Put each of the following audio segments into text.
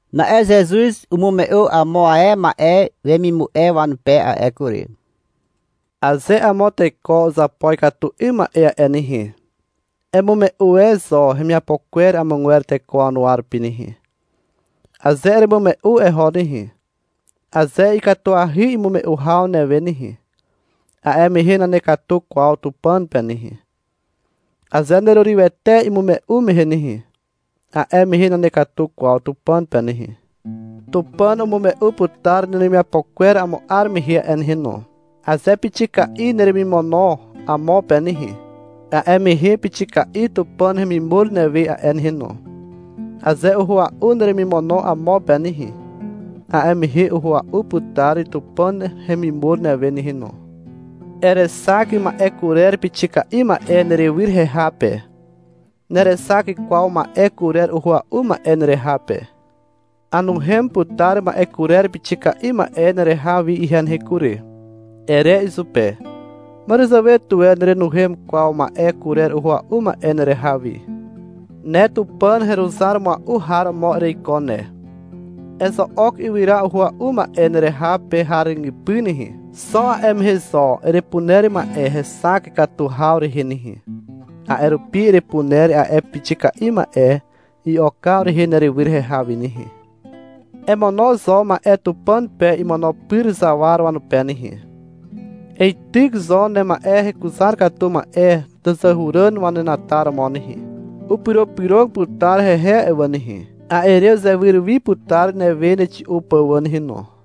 (Na'e Zezuz umume'u amo ae ma'e wemimu'e wanupe a'e kury.) — Aze amo teko uzapo ikatu 'ym ma'e a'e nehe, emume'u e zo hemiapo kwer amogwer teko wanuwa rupi nehe. Aze eremume'u eho nehe, aze ikatuahy imume'u haw newe nehe, a'e mehe nanekatu kwaw Tupàn pe nehe. Aze nerurywete imume'u mehe nehe, a'e mehe nanekatu kwaw Tupàn pe nehe. Tupàn umume'u putar neremiapo kwer amo 'ar mehe a'e nehe no. Aze pixika'i neremimono amo pe nehe, a'e mehe pixika'i Tupàn hemimur newe a'e nehe no. Aze uhua'u neremimono amo pe nehe, a'e mehe uhua'u putar Tupàn hemimur newe nehe no. Erexak ma'e kurer pixika'i ma'e nerywyr heha pe. Nerexak kwaw ma'e kurer uhua'u ma'e nereha pe. — Anuhem putar ma'e kurer pixika'i ma'e nereha wi ihe nehe kury, ere izupe. Màràzàwe tuwe nerenuhem kwaw ma'e kurer uhua'u ma'e nereha wi. Ne Tupàn heruzar mua'u har romo ereiko ne. Ezo'ok ywyra uhua'u ma'e nereha pe har ràgypy nehe. Xo a'e mehe zo erepuner ma'e hexak katu haw rehe nehe. A'e rupi erepuner a'e pixika'i ma'e i'okaw rehe nerywyr heha wi nehe. Emono zo ma'e Tupàn pe imono pyr zawar wanupe nehe. Eityk zo nema'e hekuzar katu ma'e tàzàhuràn wanenataromo nehe. Upyropyrog putar hehe a'e wà nehe. A'e re uzewyr wi putar newe nexi'u pà wà nehe no.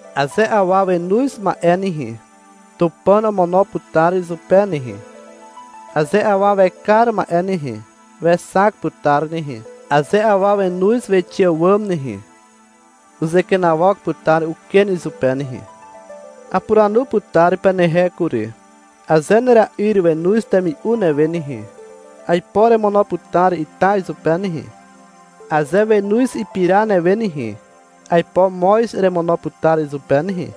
Aze awa wenoz ma'e nehe, Tupàn omono putar izupe nehe. Aze awa wekar ma'e nehe, wexak putar nehe. Aze awa wenoz wixe àwàm nehe, uzekenawok putar uken izupe nehe. Apuranu putar penehe kury. Aze nera'yr wenoz temi'u newe nehe, aipo eremono putar ita izupe nehe. Aze wenoz ipira newe nehe, aipo moz eremono putar izupe nehe.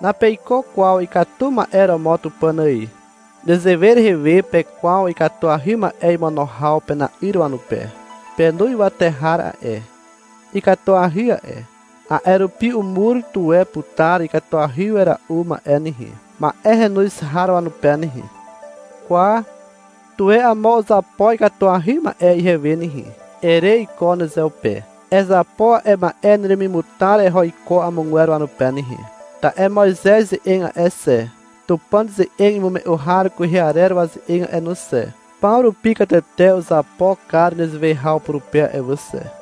Napeiko kwaw ikatu ma'e romo Tupàn ài. Nezewe rehe we pekwaw ikatuahy ma'e imono haw pena'yr wanupe. Penu ywate har a'e, ikatuahy a'e. A'e rupi umur tuwe putar ikatuahy wera'u ma'e nehe, ma'e henoz har wanupe nehe. — Kwa, tuwe amo uzapo ikatuahy ma'e ihewe nehe, ere iko nezeupe. Ezapo a'e ma'e neremimutar eho iko amogwer wanupe nehe. Ta'e Moizez ze'eg a'e xe, Tupàn ze'eg imume'u har kwehe arer waze'eg a'e no xe, paw rupi katete uzapo kar nezewe haw purupe a'e wà xe.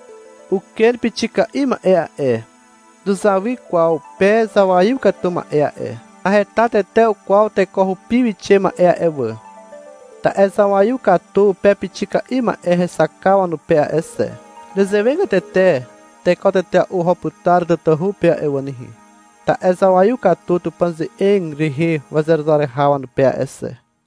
Uken pixika'i ma'e a'e, nuzawy kwaw pe zawaiw katu ma'e a'e. Naheta tete kwaw teko hupi wixe ma'e a'e wà. Ta'e zawaiw katu pe pixika'i ma'e hexakaw wanupe a'e xe. Nezewegatete teko tetea'u oho putar tatahu pe a'e wà nehe, ta'e zawaiw katu Tupàn ze'eg rehe wazeruzar haw wanupe a'e xe.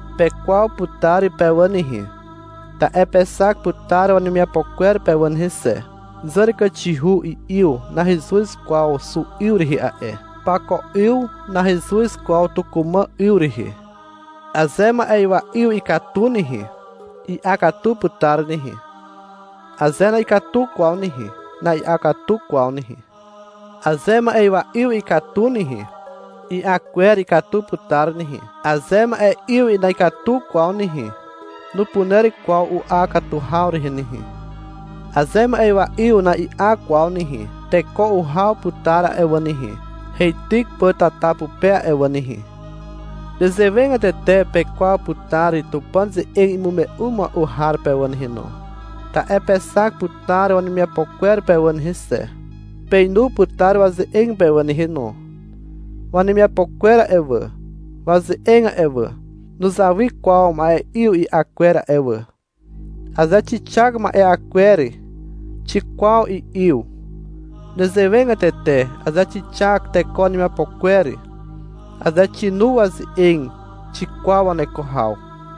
Pekwaw putar pe wà nehe, ta'e pexak putar wanemiapo kwer pe wà nehe xe. (Zàràkàxihu 'yw nahezuz kwaw xu 'yw rehe a'e. Pako 'yw nahezuz kwaw tukumà 'yw rehe.) Aze ma'ywa'yw ikatu nehe, i'a katu putar nehe. Aze na'ikatu kwaw nehe, na'i'a katu kwaw nehe. Aze ma'ywa 'yw ikatu nehe, i'a kwer ikatu putar nehe. Aze ma'e'yw na'ikatu kwaw nehe, nupuner kwaw u'a katu haw rehe nehe. Aze ma'ywa 'yw na'i'a kwaw nehe, teko uhaw putar a'e wà nehe, heityk pà tata pupe a'e wà nehe. Nezewegatete pekwaw putar Tupàn ze'eg imume'u mua'u har pe wà nehe no, ta'e pexak putar wanemiapo kwer pe wà nehe xe, peinu putar waze'eg pe wà nehe no. (Wanemiapo kwer a'e wà, waze'eg a'e wà, nuzawy kwaw ma'e'yw i'a kwer a'e wà. Aze xixak ma'e'a kwer, xikwaw i'yw. Nezewegatete aze xixak teko wanemiapo kwer, aze xinu waze'eg, xikwaw waneko haw.)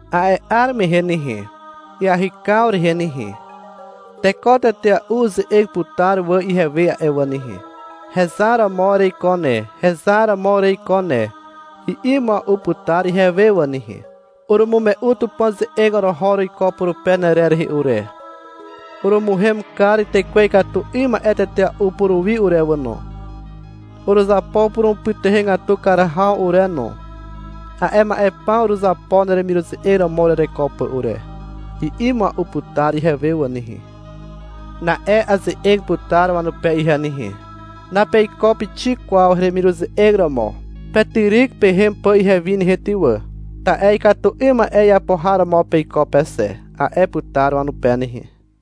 A'e 'ar mehe nehe, iahykaw rehe nehe, teko tetea'u uze'eg putar wà ihewe a'e wà nehe. — Hezar romo ereiko ne, hezar romo ereiko ne, i'i mua'u putar ihewe wà nehe. — Urumume'u Tupàn ze'eg oroho uruiko purupe nerer rehe ure. Urumuhem kar tekwe ikatu 'ym ma'e tetea'u puruwi ure wà no. Uruzapo purumupytuhegatu kar haw ure no. A'e ma'e paw uruzapo neremiruze'eg romo urereko pà ure, i'i mua'u putar ihewe wà nehe. Na'e aze'eg putar wanupe ihe nehe. — Napeiko pixik kwaw heremiruze'eg romo. Petyryk pehem pà ihewi nehe ty wà, ta'e ikatu 'ym ma'e iapo har romo peiko pe xe, a'e putar wanupe nehe.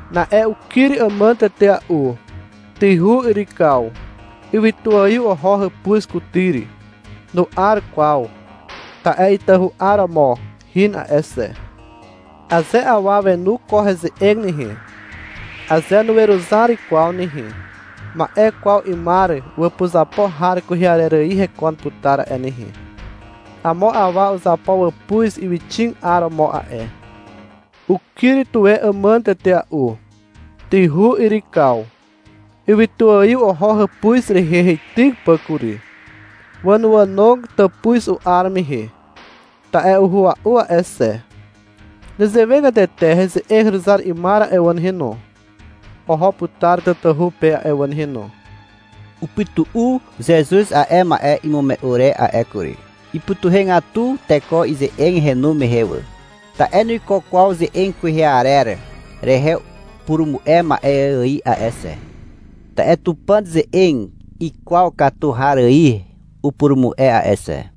Na'e ukyr àmàn tetea'u. Tyhu yrykaw. Ywytuaiw oho hàpuz kutyr. Nu'ar kwaw, ta'e itahu 'aromo hin a'e xe. Aze awa wenu ko heze'eg nehe, aze nuweruzar kwaw nehe, ma'e kwaw 'ymar wàpuzapo har kwehe arer ài hekon putar a'e nehe. Amo awa uzapo wàpuz ywyxig 'aromo a'e. Ukyr tuwe àmàn tetea'u. Tyhu yrykaw. Ywytuaiw oho hàpuz rehe heityk pà kury. Wànoànog tàpuz u'ar mehe, ta'e uhua'u a'e xe. Nezewegatete heze'eg heruzar 'ymar a'e wà nehe no, oho putar tatahu pe a'e wà nehe no. Upytu'u Zezuz a'e ma'e imume'u re a'e kury. Ipytuhegatu teko ize'eg henu mehe wà. Ta'e nuiko kwaw ze'eg kwehe arer rehe purumu'e ma'e ài a'e xe, ta'e Tupàn ze'eg ikwaw katu har ài upurumu'e a'e xe.